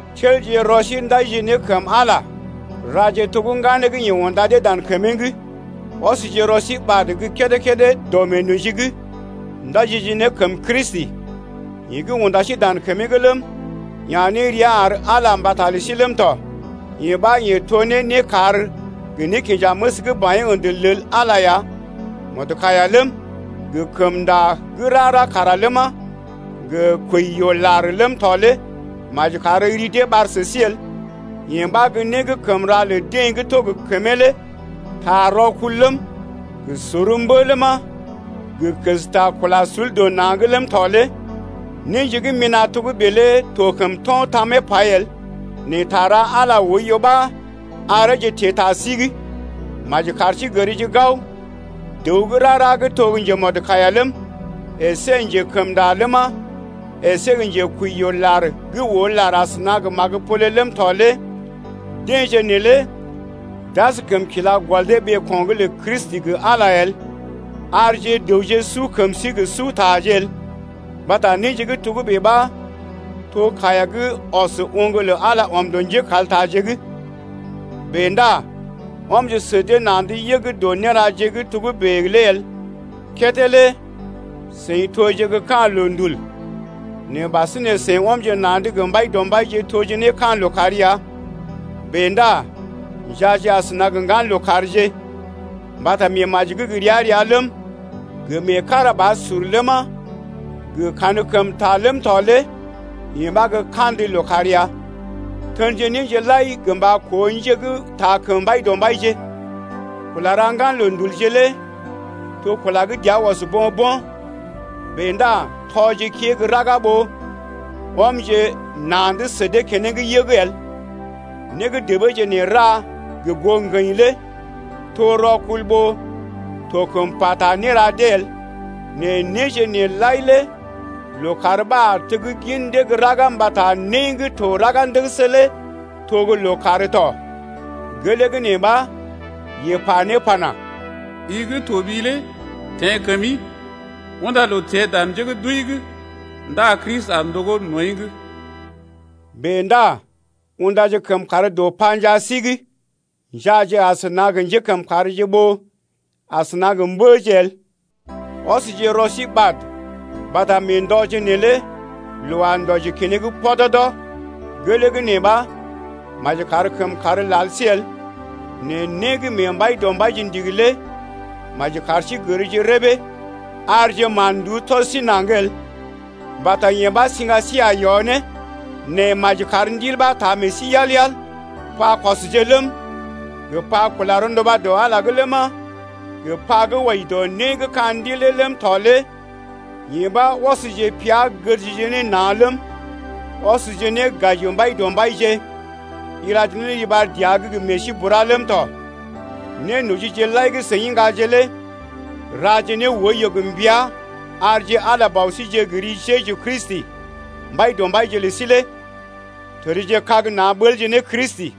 Telje rɔ sí ndajije ne kəm Ala raje to gə́ ŋganeeje gə́ yeḛ unda dee dan kəmee’g. Ɔsje rɔ sí ɓad gə́ kédé-kédé dɔ meenoji’g, ndajije ne kəm Kristi, yeḛ gə́ unda sí dan kəmee’g ləm, ya̰ ne rəa ar Ala mbata lə sí ləm tɔ. Yee ɓa yeḛ to ne nékar gə nékinjaməs gə́ baḭyee ə̰də lel Ala ya. Mɔdkaiya ləm, gə kəmnda gə́ rara kara ləma, gə kwəi-yoo-lar ləm tɔ lé maji kar ri dee ɓar sə sí el. Yee ɓa gə́ né gə́ kəm ra lə deḛ gə́ to gə kəmee lé. Ta rɔkul ləm, gə sor mbə ləma, gə kəsta kula sul dɔ na̰’g ləm tɔ lé néje gə́ mina̰ togə́bè lé to kəm to̰ tamee pai el, nɛ ta ra Ala oiyo ɓa areeje teḛ ta sí’g. Maji kar sí gərje gao, dəw gə́ rara gə́ to njemɔdkaiya ləm, əsé njekəmnda ləma, əsé njekwəi-yoo-lar gə́ oo lar asəna gə magəpole ləm tɔ lé deḛje neelé d’askəm kila gɔl dee ɓeeko̰’g lə Kristi gə Ala el. Arje dəwje su kəm sí gə sutaje el, mbata néje gə́ togə́bè ɓa to kaiya gə́ ɔs oŋg lə Ala ɔm dɔ njékaltaje’g. Bèe ndá ɔmje sə dee na̰’d yəg dɔ néraje gə́ togə́bè lé el. Kédé lé seḭ toje gə́ ka̰ loondul, nɛ ɓasinè seḭ ɔmje na̰’d gə Mbaidɔmbaije toje ne ka̰ lookàr ya. Bèe ndá njaaje asəna gə ŋgan lookàrje. Mbata meemaji gə́ gə ria-ria ləm, gə meekarabasur ləma, gə kankəmta ləm tɔ lé yee ɓa gə́ kandə lookàr ya. Tenje néje lai gə mba koo njé gə́ taa kəm Mbaidɔmbaije. Kula ra ŋgan loondulje lé to kula gə́ dəa ɔs bo̰-bo̰, bèe ndá tɔje kée gə́ raga ɓó ɔmje na̰’d sə dee keneŋ yəg el. Né gə́ debeeje nee ra gə goo ŋgəḭ lé to rɔkul ɓó to kəm pata néra dee el. Nɛ néje nee lai lé lookàr ɓa a teggin dee gə́ raga mbata né gə́ to raga ndəgəsə lé to gə́ lookàr tɔ. Gelee gə́ nee ɓa, yeḛ pa ne pana: I gə́ toɓi lé teḛ kəmi, Unda loo teḛ dan njé gə́ d’wəi’g Ndá Kristi a ndogó nɔḭ’g. Bèe ndá undaje kəmkàr dɔ panjaa sí’g, njaaje asəna gə njékəmkàrje ɓó asəna gə mbəje el. Ɔsje rɔ sí ɓad mbata mee ndɔje neelé loo a ndɔji keneŋ pɔdɔdɔ. Gelee gə́ nee ɓa maji kar kəmkàr lal sí el, nɛ né gə́ mee Mbaidɔmbaije ndigi lé maji kar sí gərje rəbee. Arje mán-nduú tɔs sí naŋg el mbata yee ɓa siŋga sí a yɔ ne. Nɛ maji kar Ndil ɓa taa meḛ sí yal-yal. Pakɔsje ləm, gə pa kula rɔnduba dɔ Ala’g ləma, pa gə wɔji dɔ né gə́ ka̰ ndil lé ləm tɔ lé yee ɓa ɔsje pea gədje ne na̰ ləm, ɔsje ne gaji Mbaidɔmbaije, ilaje ne riɓar dəa’g gə meḛ sí bura ləm tɔ. Nénojije lai gə́ seḭ iŋgaje lé raje ne oiyo gə mbəa arje Ala Bɔ síje gə ri Jeju Kristi Mbaidɔmbaije lə sí lé. Tədjekag na̰ ɓəlje ne Kristi.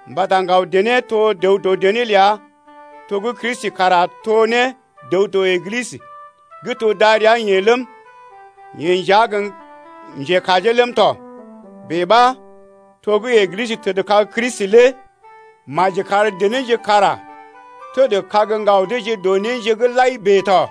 mbata ŋgaw dené to dəw dɔ dené ləa to gə́ Kristi kara to ne dəw dɔ Eglisə gə́ to darəa-yeḛ ləm, yeḛ nja gə́ njekajee ləm tɔ. Bèe ɓa, to gə́ Eglisə təd ne kag Kristi lé maji kar denéje kara tədkag ŋgaw deeje dɔ néje’g lai bèe tɔ.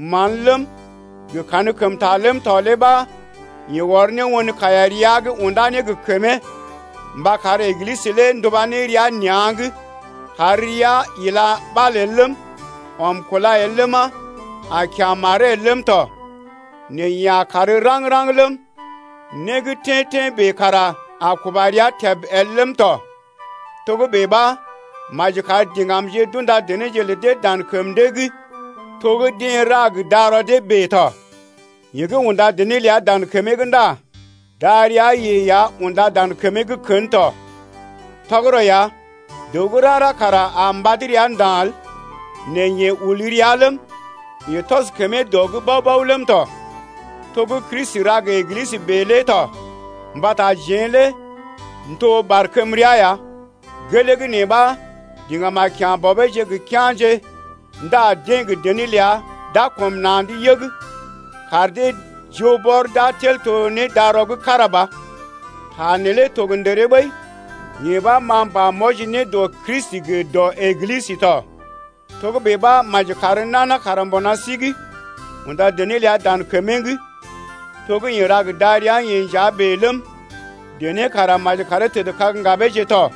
Man ləm, gə kankəmta ləm tɔ lé ɓa yeḛ ɔr ne won kaiya rəa’g unda ne gə kəmee mba kar Eglisə lé nduba ne rəa nea̰’g, kar rəa ila ɓal el ləm, ɔm kúla el ləma, a kya̰ maree el ləm tɔ, nɛ yee a kàr raŋg-raŋg ləm, né gə́ tḛ́-tḛ́ bèe kara a kuba rəa təb el ləm tɔ. Togə́bè ɓa, maji kar diŋgamje d’unda denéje lə dee dan kəm dee’g to gə́ deḛ ra gə darɔ dee bèe tɔ. Yeḛ gə́ unda dené ləa dan kəmee’g ndá darəa-yeḛ ya unda dan kəmee’g kən tɔ. Tɔgərɔ ya, dəw gə́ rara kara a mbad rəa nda̰ el, nɛ yeḛ ul rəa ləm, yeḛ tɔs kəmee dɔ’g bao-bao ləm tɔ, to gə́ Kristi ra ne gə Eglisə bèe lé tɔ, mbata jeḛ lé n’to barkəmrea ya. Gelee gə́ nee ɓa, diŋgam a kya̰ bɔbeeje gə kea̰je ndá deḛ gə dené ləa d’a kɔm na̰’d yəg kar deḛ joo bɔr d’a tel to ne darɔ gə́ kára ba. Ta neelé to gə ndəree ɓəi, yee ɓa ma m’pa m’wɔji ne dɔ Kristi gə dɔ Eglisə tɔ. Togə́bè ɓa, maji kar nana kara mbuna sí’g unda dené ləa dan kəmee’g to gə́ yeḛ ra ne gə darəa-yeḛ nja bèe ləm, dené kara maji karee tədkag ŋgabeeje tɔ.